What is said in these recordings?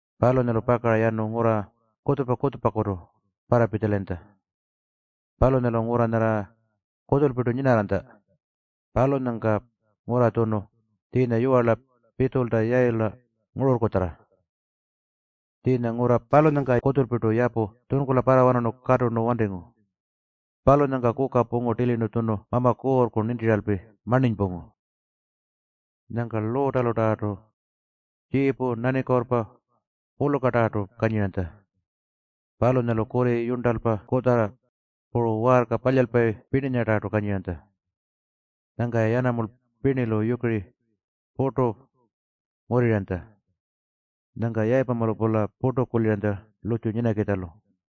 Palunyalu pakara yanu ngurra kutjupa-kutjupakutu parrapitjalayintja. Palunyalu ngurra nyarra kutjulpirtu nyinarranytja, palunyangka ngurra tjunu tjiinya yiwarla Pitjulta Yayila ngururrkutjarra. Tjiinya ngurra palunyangka kutjulpirtu yapu tjunkula parrawanarnu katurnu wantingu. Palunyangka kuka pungu tilirnu tjunu Mama Kuurrku nintiralpi marninypungu. Nyangka Luutalutarrartu tjiipu, nanikuurrpa puru pulukatarrartu kanyiranytja. Palunyalu kurri, yurntalpa kutjarra, puru waarka palyalpayi pirninyatarrartu kanyiranytja. Nyangka-ya yanamulpa pirnilu yukiriku purtu ngurriranytja. Nyangka Yayipamalu-pula purtu kuliranytja lurrtju nyinakitjalu.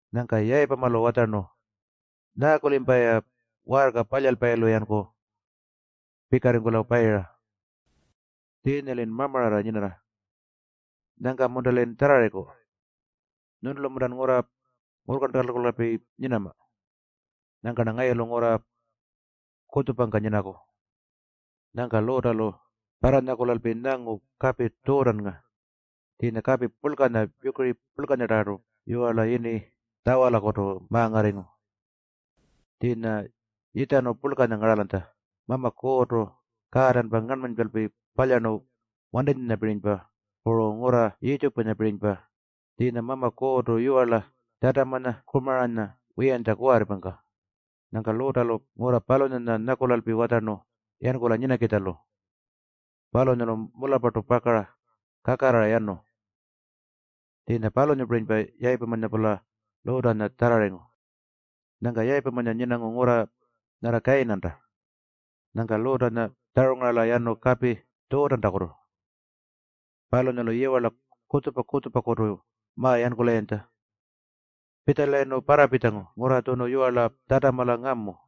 Nyangka Yayipamalu watjarnu, “Nyaaku-limpa-ya waarka palyalpayilu-yanku pikarringkula payira? Tjiinya-lin mamararra nyinarra. Nyangka-munta-lin tjarrarriku? Nyuntulu-muntan ngurra ngurrkarntankulalpi nyinama? Nyangka-rna ngayulu ngurra kutjupangka nyinaku.” Nyangka Luutalu parranyakulalpi nyangu kapi Tjuutannga. Tjiinya kapi purlkanya, yukiri purlkanyatarrartu yiwarla yini Tjawalakutu ma-ngarringu. Tjiinya yitjarnu purlkanya ngaralanytja, Mama Kuurrtu kaatanpa ngarnmanypalpi palyarnu wantitjapirinypa puru ngurra Yiitjipunyapirinypa. Tjiinya Mama Kuurrtu yiwarla Tjatamanya Kumaranya wiyantja kuwarripangka. Nyangka Luutalu ngurra palunyanya nyakulalpi watjarnu yankula nyinakitjalu. Palunyalu mularrpartu pakara kakarrara yanu. Tjiinya palunyapirinypa Yayipamanya-pula Luutanya tjarrarringu. Nyangka Yayipamanya nyinangu ngurra nyarra Kayinanta. Nyangka Luutanya tjarungarala yanu kapi Tjuutantakutu. Palunyalu yiwarla kutjupa-kutjupakutu ma-yankulayintja. Pitjalayirnu parrapitjangu ngurra tjunu yiwarla Tjatamala ngamu.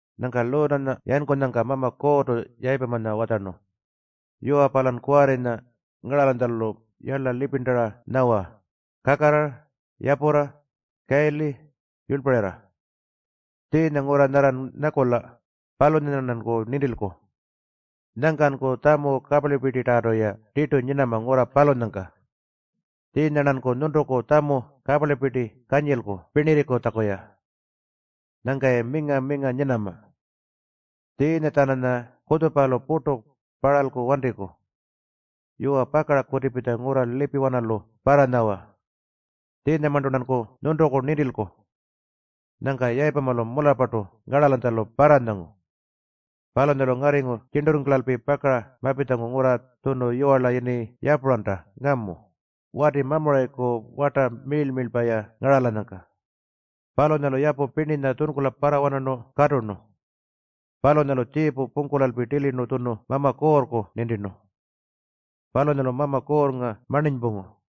Nyangka Luutanya yankunyangka Mama Kuurrtu Yayipamanya watjarnu, “Yuwa, palan kuwarrinya ngaralanytjalu yarla lipirntara nyawa kakarrara, yapurra, kayili, yurlparirra. Tjiinya ngurra nyarran nyakula, palunyanya-rnanku nintilku. Nyangkanku tjamu kaparlipirtitarrartu-ya tirtu nyinama ngurra palunyangka. Tjiinya-rnanku nyuntuku tjamu kaparlipirti kanyilku pirnirringkutjaku-ya. Nyangka-ya minga-minga nyinama. Tjiinya-tjananya kutjupalu purtu parralku wantiku. Yuwa, pakara kutipitja ngurra lipiwanalu parranyawa. Tjiinyamarntu-rnanku nyuntuku nintilku.” Nyangka Yayipamalu mularrpartu ngaralanytjalu parranyangu. Palunyalu ngarringu tjirnturringkulalpi pakara mapitjangu ngurra tjunu yiwarla yini Yapuranta ngamu, wati Mamurayiku warta miirl-miirlpa-ya ngaralanyangka. Palunyalu yapu pirninya tjunkula parrawanarnu katurnu. Palunyalu tjiipu pungkulalpi tilirnu tjunu Mama Kuurrku nintirnu. Palunyalu Mama Kuurrnga marninypungu.